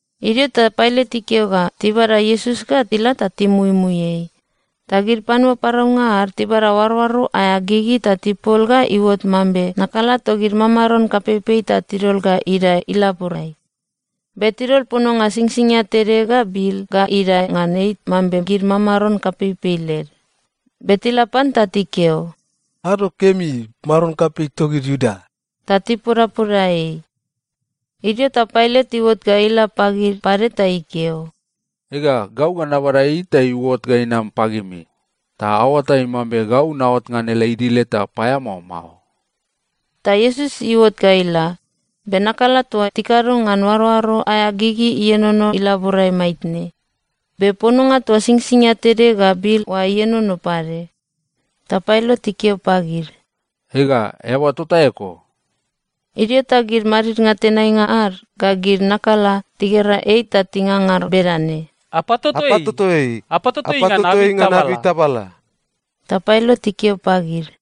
Idio ta Pailat ikeo ga tibada Iesus ga ila ta timuimui ei. Ta gid panua paraunga ad tibada oaroaro aea gigi ta tipol ga iuot mambe nakala togid mamaron kapeipei ta tidol ga idae ilaborai. Be tidol pononga singsingia tede ga bil ga idae ngan ei mambe gid mamaron kapeipei led. Be tila pan ta tikeo, “Ado kemi, maron kapei togid Iuda!” Ta tipodapoda ei. Idio ta Pailat iuot ga ila pagid pade ta ikeo, “Ega, gau ga nabada ei ta iuot ga inam pagimi ta aoatai mambe gau naot ngan ele idil eta paeamao mao.” Ta Iesus iuot ga ila, be nakala toa tikado ngan oaroaro aea gigi ienono ilaborai maitne. Be pononga toa singsingia tede ga bil oa ienono pade. Ta Pailat ikeo pagid, “Ega, eaba tota eko.” Idio ta gid madidnga tenainga ad ga gid nakala tigera ei ta tingangar bedane, “Apatoto ei! Apatoto ei ngan abei tabala!” Ta Pailat ikeo pagid,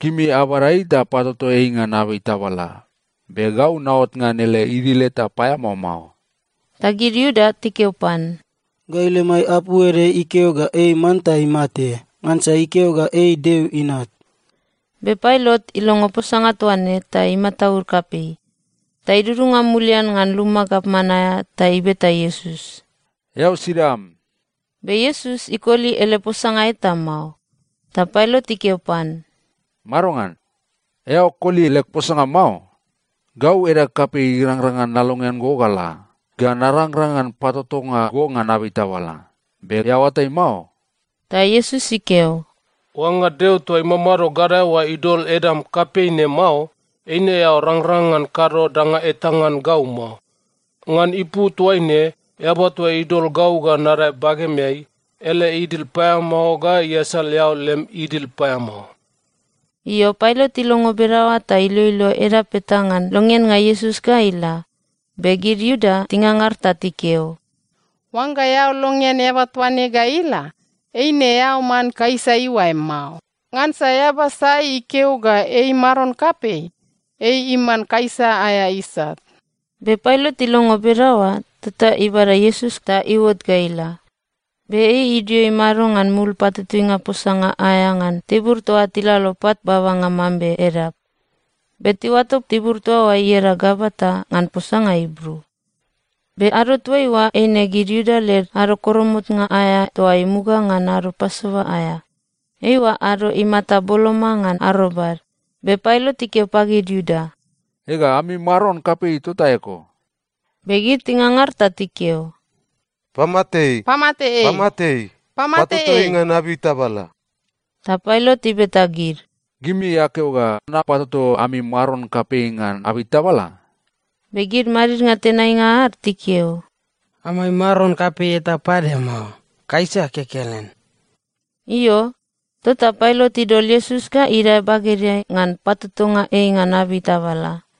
“Gimi abada ei ta apatoto ei ngan abei tabala, be gau naot ngan ele idil eta paeamao mao.” Ta gid Iuda tikeo pan, “Gai lemai apu ede ikeo ga ei manta imate, ngansa ikeo ga ei Deo Inat.” Be Pailat ilongo posanga toa ne ta imataud kapei. Ta idudunga mulian ngan luma gavman aea ta ibeta Iesus, “Eao sida am?” Be Iesus ikoli ele posanga eta mao. Ta Pailat ikeo pan, “Madongan? Eao koli leg posanga mao? Gau edag kapei irangrang ngan nalongean go ga la, ga narangrang ngan patotonga go ngan abei tabala. Be eao oatai mao?” Ta Iesus ikeo, “Oangga Deo toa imamado gadae oa idol edam kapei ne mao, eine eao rangrang ngan kado danga eta ngan gau mao. Ngan ipu toaine eaba toa idol gau ga nadae bagemeai, ele idil paeamao ga iasal eao lem idil paeamao.” Io, Pailat ilongo bedaoa ta iloilo edap eta ngan longeannga Iesus ga ila, be gid Iuda tingangar ta tikeo, “Oangga eao longean eaba toa ne ga ila, eine eao man Kaisa iuae mao. Ngansa eaba sai ikeo ga ei maron kapei, ei iman Kaisa aea isat.” Be Pailat ilongo bedaoa tota ibada Iesus ta iuot ga ila, be ei idio imado ngan mul patutuinga posanga aea ngan tibur toa tilalo pat babanga mambe edap. Be tiuato tibur toa oa ieda Gabata ngan posanga Ibru. Be ado toaiua eine gid Iuda led Ado Koromotnga aea toa imuga ngan Ado Pasova aea. Eiua ado imata boloma ngan arobad, be Pailat ikeo pagid Iuda, “Ega, ami maron kapei tota eko.” Be gid tingangar ta tikeo, “Pamate ei! Pamate ei! Patoto ei ngan abei tabala!” Ta Pailat ibeta gid, “Gimi akeo ga napatoto ami maron kapei ngan abei tabala?” Be gid madidnga tenainga ad tikeo, “Amai maron kapei eta pade mao. Kaisa kekelen.” Io, tota Pailat idol Iesus ga idae bagedeai ngan patotonga ei ngan abei tabala.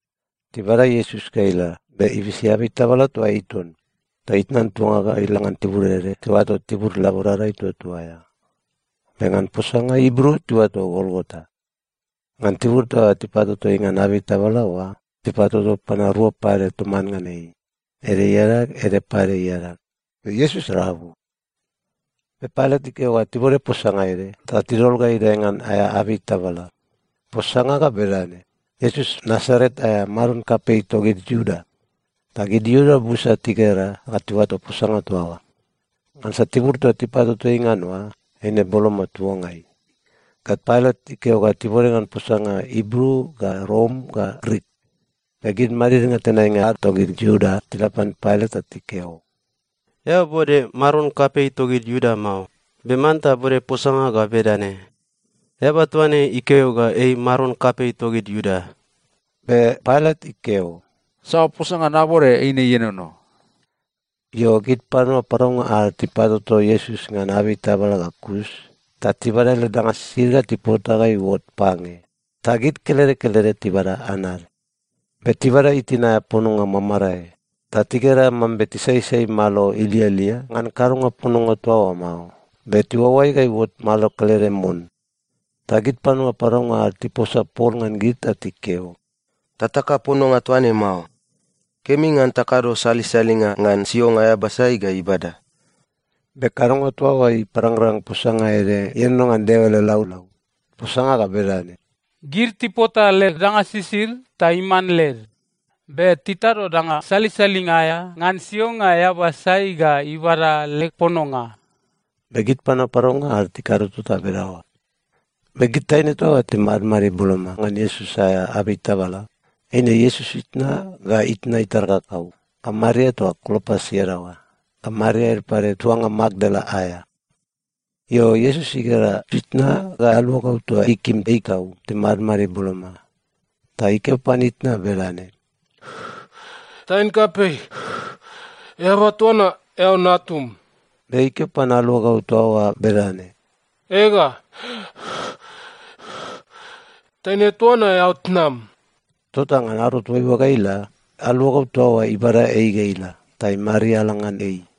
Tibada Iesus ga ila, be ibisi abei tabala toa ei ton, ta itnan tuanga ga ila ngan tibur ede tiuato Tibur Laborada Ituatua aea. Be ngan posanga Ibru tiuato Golgota. Ngan tibur toa tipatoto ei ngan abei tabala oa, tipatoto panua rua pade toman ngan ei, ede iadag, ede pade iadag, be Iesus rabu. Be Pailat ikeo ga tibode posanga ede ta tidol ga idae ngan aea abei tabala. Posanga ga bedane: Iesus Nasaret aea, maron kapei togid Iuda. Ta gid Iuda busa tigera ga tiuato posanga toa oa, ngansa tibur toa tipatoto ei ngan oa, eine boloma tuangai ga Pailat ikeo ga tibode ngan posanga Ibru ga Rom ga Grik. Be gid madidnga tenainga ad togid Iuda tila pan Pailat ta tikeo, “Eao bode ‘Maron kapei togid Iuda’ mao, be manta bode posanga ga bedane, ‘Eaba toa ne ikeo ga ei maron kapei togid Iuda.’” Be Pailat ikeo, “Saoa posanga nabode, eine ienono.” Io, gid panua paraunga ad tipatoto Iesus ngan abei tabala ga kus ta tibada ele danga sisid ta tipota ga iuot pange. Ta gid kelede kelede tibada anad. Be tibada itin aea pononga mamarae, ta tigera mambe tisaisai malo ilialia ngan kadonga pononga toa oa mao, be tiuaoai ga iuot malo kelede mon. Ta gid panua paraunga ad tiposa pol ngan gid ta tikeo, “Tataka pononga toa ne mao. Kemi ngan takado salisalinga ngan sionga eaba sai ga ibada.” Be kadonga toa oa iparangrang posanga ede ienono ngan Deo ele laulau. Posanga ga bedane, “Gid tipota leg danga sisid ta iman led, be titado danga salisalinga aea ngan sionga eaba sai ga ibada leg pononga.” Be gid panua paraunga ad tikado tota bedaoa. Be gid taine toa timadmadid boloma ngan Iesus aea abei tabala, eine Iesus itna, ga itna itar kakau, ga Maria toa Klopas iadaoa, ga Maria ede pade tuanga Makdala aea. Io, Iesus igera itna ga aluagau toa ikim ei tau timadmadid boloma. Ta ikeo pan itna bedane, “Taine kapei, eaba toa na eao natum.” Be ikeo pan aluagau toa oa bedane, “Ega, taine toa na eao tnam.” Tota ngan ado toaiua ga ila, aluagau toa oa ibada ei ga ila ta imariala ngan ei.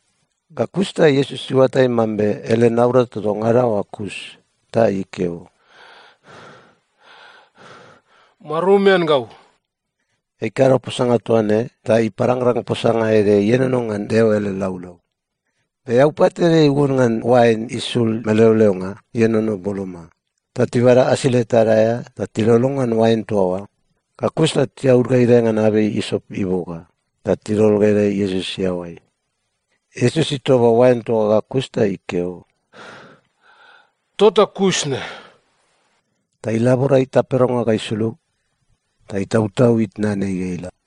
Ga kus ta Iesus iuatai mambe ele naurata toa ngada oa kus. Ta ikeo, “Marumian gau.” Ei ikado posanga toa ne ta iparangrang posanga ede ienono ngan Deo ele laulau. Be eaupat ede iuon ngan oain isul meleoleonga ienono boloma. Ta tibada asile tad aea ta tilolo ngan oain toa oa. Ga kus ta tiaud ga idae ngan abei isop iboga ta tidol ga idae Iesus iaoai. Iesus itoba oain toa oa ga kus ta ikeo, “Tota kus ne.” Ta ilabora itaperonga ga isulug ta itautau itnan ei ga ila.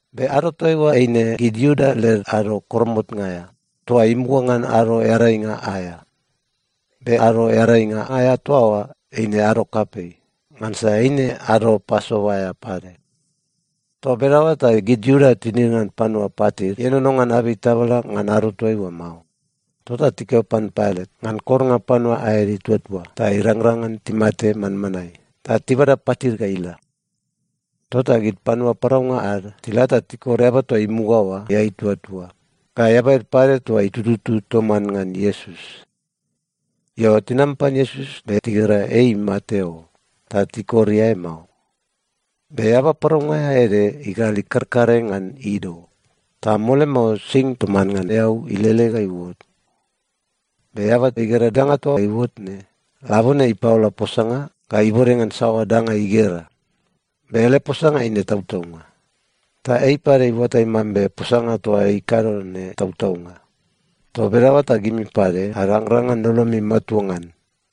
Be ado toaiua eine gid Iuda led Ado Koromotnga aea toa imuga ngan Ado Earainga aea. Be Ado Earainga aea toa oa eine ado kapei, ngansa eine Ado Pasova aea pade. Toa bedaoa ta gid Iuda tinid ngan panua patid ienono ngan abei tabala ngan ado toa oa mao. Tota tikeo pan Pailat ngan kornga panua aed ituatua ta irangrang ngan timate manmanae, ta tibada patid ga ila. Tota gid panua paraunga ad tila ta tikor eaba toa imuga oa iae ituatua, ga eaba ede pade toa itututu toman ngan Iesus. Io, tinam pan Iesus be tigera ei imate o. Ta tikor iae mao. Be eaba paraunga aea ede igal ikarkare ngan ido. Ta mole mao, sing toman ngan eau ilele ga iuot. Be eaba igera danga toa iuot ne, labone ipaola posanga ga ibode ngan saoa danga igera. Be ele posanga eine tautaunga. Ta ei pade iuatai mambe posanga toa ikado ne tautaunga. Toa bedaoa ta gimi pade arangrang ngan lolomi matua ngan.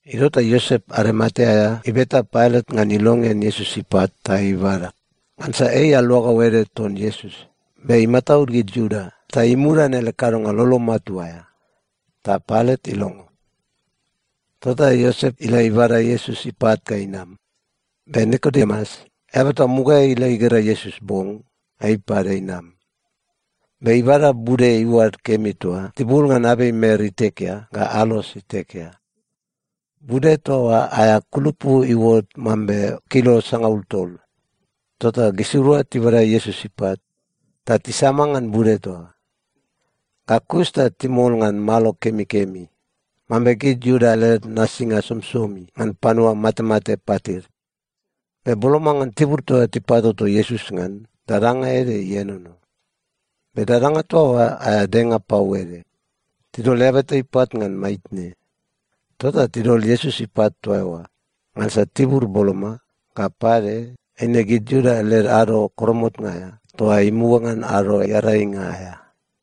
Idio ta Iosep Arimatea aea ibeta Pailat ngan ilongean Iesus ipat ta ibada. Ngansa ei aluagau ede ton Iesus be imataud gid Iuda ta imudan ele kadonga lolo matua aea. Ta Pailat ilongo. Tota Iosep ila ibada Iesus ipat ga inam. Be Nikodemus, eaba toa mugaeai ila igera Iesus bong, ei pade inam. Be ibada bude iuad kemi toa tibul ngan abei mer itekea ga alos itekea. Bude toa oa aea kulupu iuot mambe kilo sangaul tol. Tota gisirua tibada Iesus ipat ta tisama ngan bude toa oa. Ga kus ta timol ngan malo kemikemi mambe gid Iuda led nasinga somisomi ngan panua matemate patid. Be boloma ngan tibur toa tipatoto Iesus ngan, dadanga ede ienono. Be dadanga toa oa aea denga pau ede. Tidol eaba eta ipat ngan maitne. Tota tidol Iesus ipat toa eoa, ngansa tibur boloma, ga pade, eine gid Iuda led Ado Koromotnga aea toa imuga ngan Ado Earainga aea.